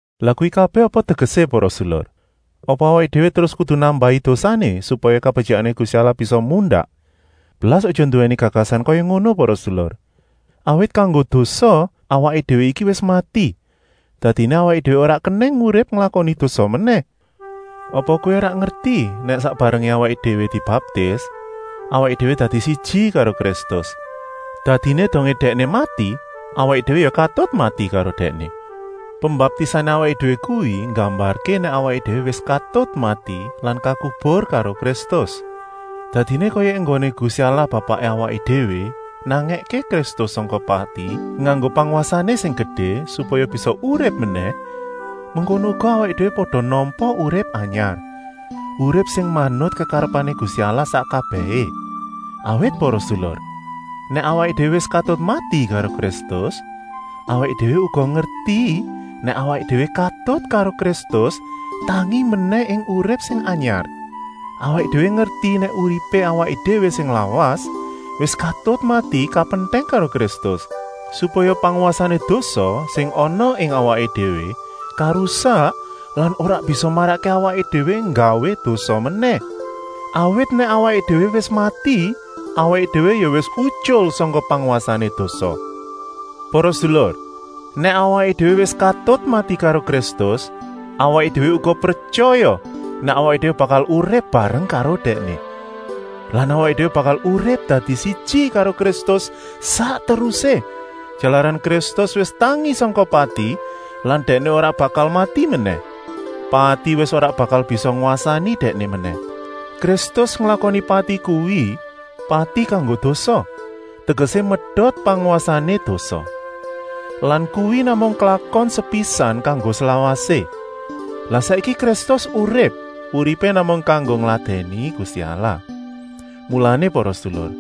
Lah kuwi kabèh apa tegesé para sedulur? Apa awaké déwé terus kudu nambahi dosané, supaya kabetyikané Gusti Allah bisa mundak? Blas aja nduwèni gagasan kaya ngono, para sedulur! Awit kanggo dosa awaké déwé iki wis mati, dadiné awaké déwé ora kenèng urip nglakoni dosa menèh. Apa kowé ora ngerti nèk sak barengé awaké déwé dibaptis, awaké déwé dadi siji karo Kristus. Dadiné dongé Dèkné mati, awaké déwé ya katut mati karo Dèkné. Pembaptisané awaké déwé kuwi nggambarké nèk awaké déwé wis katut mati lan kakubur karo Kristus. Dadiné kaya enggoné Gusti Allah Bapaké awaké déwé nangèké Kristus sangka pati nganggo pangwasané sing gedé, supaya bisa urip menèh, mengkono uga awaké déwé pada nampa urip anyar, urip sing manut kekarepané Gusti Allah sak kabèhé. Awit para sedulur, nèk awaké déwé wis katut mati karo Kristus, awaké déwé uga ngerti nèk awaké déwé katut karo Kristus tangi menèh ing urip sing anyar. Awaké déwé ngerti nèk uripé awaké déwé sing lawas wis katut mati kapentèng karo Kristus, supaya pangwasané dosa sing ana ing awaké déwé karusak lan ora bisa marakké awaké déwé nggawé dosa menèh. Awit nèk awaké déwé wis mati, awaké déwé ya wis utyul sangka pangwasané dosa. Para sedulur, nèk awaké déwé wis katut mati karo Kristus, awaké déwé uga pretyaya, nèk awaké déwé bakal urip bareng karo Dèkné. Lan awaké déwé bakal urip dadi siji karo Kristus sak terusé, jalaran Kristus wis tangi sangka pati lan Dèkné ora bakal mati menèh. Pati wis ora bakal bisa ngwasani Dèkné menèh. Kristus nglakoni pati kuwi pati kanggo dosa, tegesé medot pangwasané dosa. Lan kuwi namung klakon sepisan kanggo slawasé. Lah saiki Kristus urip, uripé namung kanggo ngladèni Gusti Allah. Mulané para sedulur,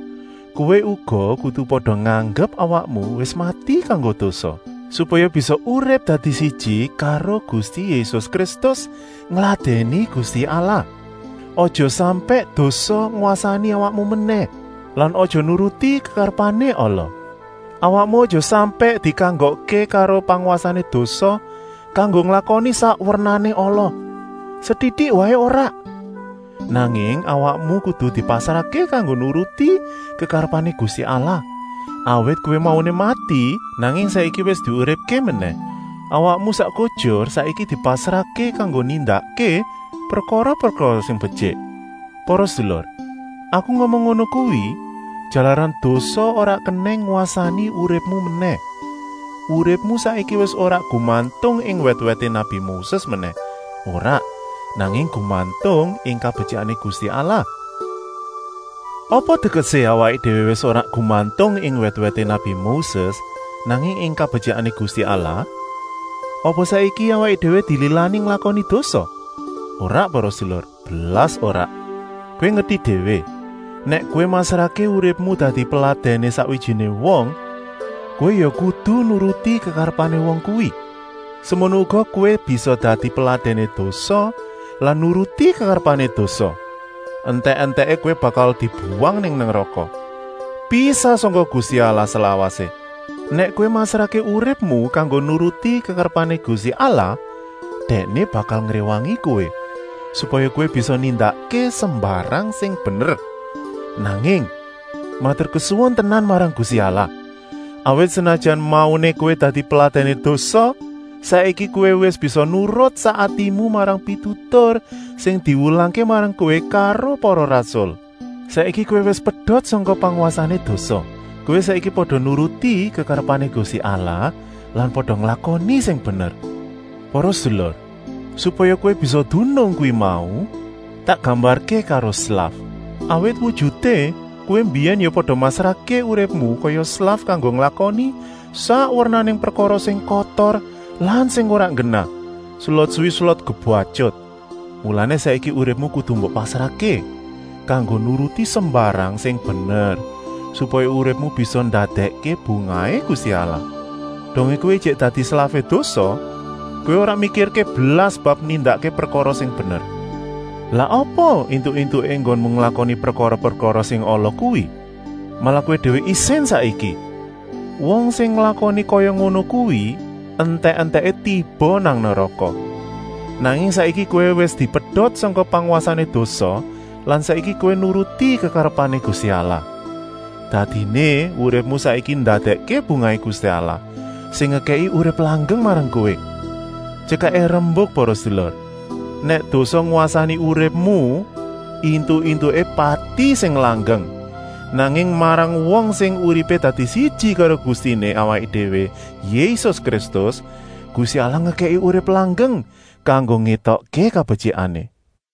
kowé uga kudu pada nganggep awakmu wis mati kanggo dosa, supaya bisa urip dadi siji karo Gusti Yésus Kristus, ngladèni Gusti Allah. Aja sampèk dosa ngwasani awakmu menèh lan aja nuruti kekarepané ala. Awakmu aja sampèk dikanggokké karo pangwasané dosa kanggo nglakoni sak wernané ala. Setitik waé ora. Nanging awakmu kudu dipasrahké kanggo nuruti kekarepané Gusti Allah, awit kowé mauné mati, nanging saiki wis diuripké menèh. Awakmu sak kujur saiki dipasrahké kanggo nindakké prekara-prekara sing betyik. Para sedulur, aku ngomong ngono kuwi, jalaran dosa ora kenèng ngwasani uripmu menèh. Uripmu saiki ora gumantung ing wèt-wèté nabi Moses menèh, ora, nanging gumantung ing kabetyikané Gusti Allah. Apa tegesé awaké déwé wis ora gumantung ing wèt-wèté nabi Moses, nanging ing kabetyikané Gusti Allah? Apa saiki awaké déwé dililani nglakoni dosa? Ora para sedulur, blas ora! Kowé ngerti déwé, nèk kowé masrahké uripmu dadi peladèné sakwijiné wong, kowé ya kudu nuruti kekarepané wong kuwi. Semono uga kowé bisa dadi peladèné dosa lan nuruti kekarepané dosa. Entèk-entèké kowé bakal dibuwang nang neraka, pisah sangka Gusti Allah slawasé. Nèk kowé masrahké uripmu kanggo nuruti kekarepané Gusti Allah, Dèkné bakal ngréwangi kowé, supaya kowé bisa nindakké sembarang sing bener. Nanging, maturkesuwun tenan marang Gusti Allah! Awit senajan mauné kowé dadi peladèné dosa, saiki kowé wis pada nurut sak atimu marang pitutur sing diwulangké marang kowé karo para rasul. Saiki kowé wis pedot sangka pangwasané dosa, kowé saiki pada nuruti kekarepané Gusti Allah lan pada nglakoni sing bener. Para sedulur, supaya kowé bisa dunung kuwi mau, tak gambarké karo slaf. Awit wujuté kowé mbiyèn ya pada masrahké uripmu kaya slaf kanggo nglakoni sak wernané prekara sing kotor lan sing ora nggenah, selot suwi selot kebatyut. Mulané saiki uripmu kudu mbok pasrahké, kanggo nuruti sembarang sing bener, supaya uripmu bisa ndadèkké bungahé Gusti Allah. Dongé kowé ijik dadi slafé dosa, kowé ora mikirké blas bab nindakké prekara sing bener. Lah apa éntuk-éntuké enggonmu nglakoni prekara-prekara sing ala kuwi? Malah kowé déwé isin saiki. Wong sing nglakoni kaya ngono kuwi entèk-entèké tiba nang neraka. Nanging saiki kowé wis dipedot sangka pangwasané dosa lan saiki kowé nuruti kekarepané Gusti Allah. Dadiné uripmu saiki ndadèkké bungahé Gusti Allah, sing ngekèki urip langgeng marang kowé. Tyekaké rembuk para sedulur, nèk dosa ngwasani uripmu, éntuk-éntuké pati sing langgeng. Nanging marang wong sing uripé dadi siji karo Gustiné awaké déwé Yésus Kristus, Gusti Allah ngekèki urip langgeng, kanggo ngétokké kabetyikané.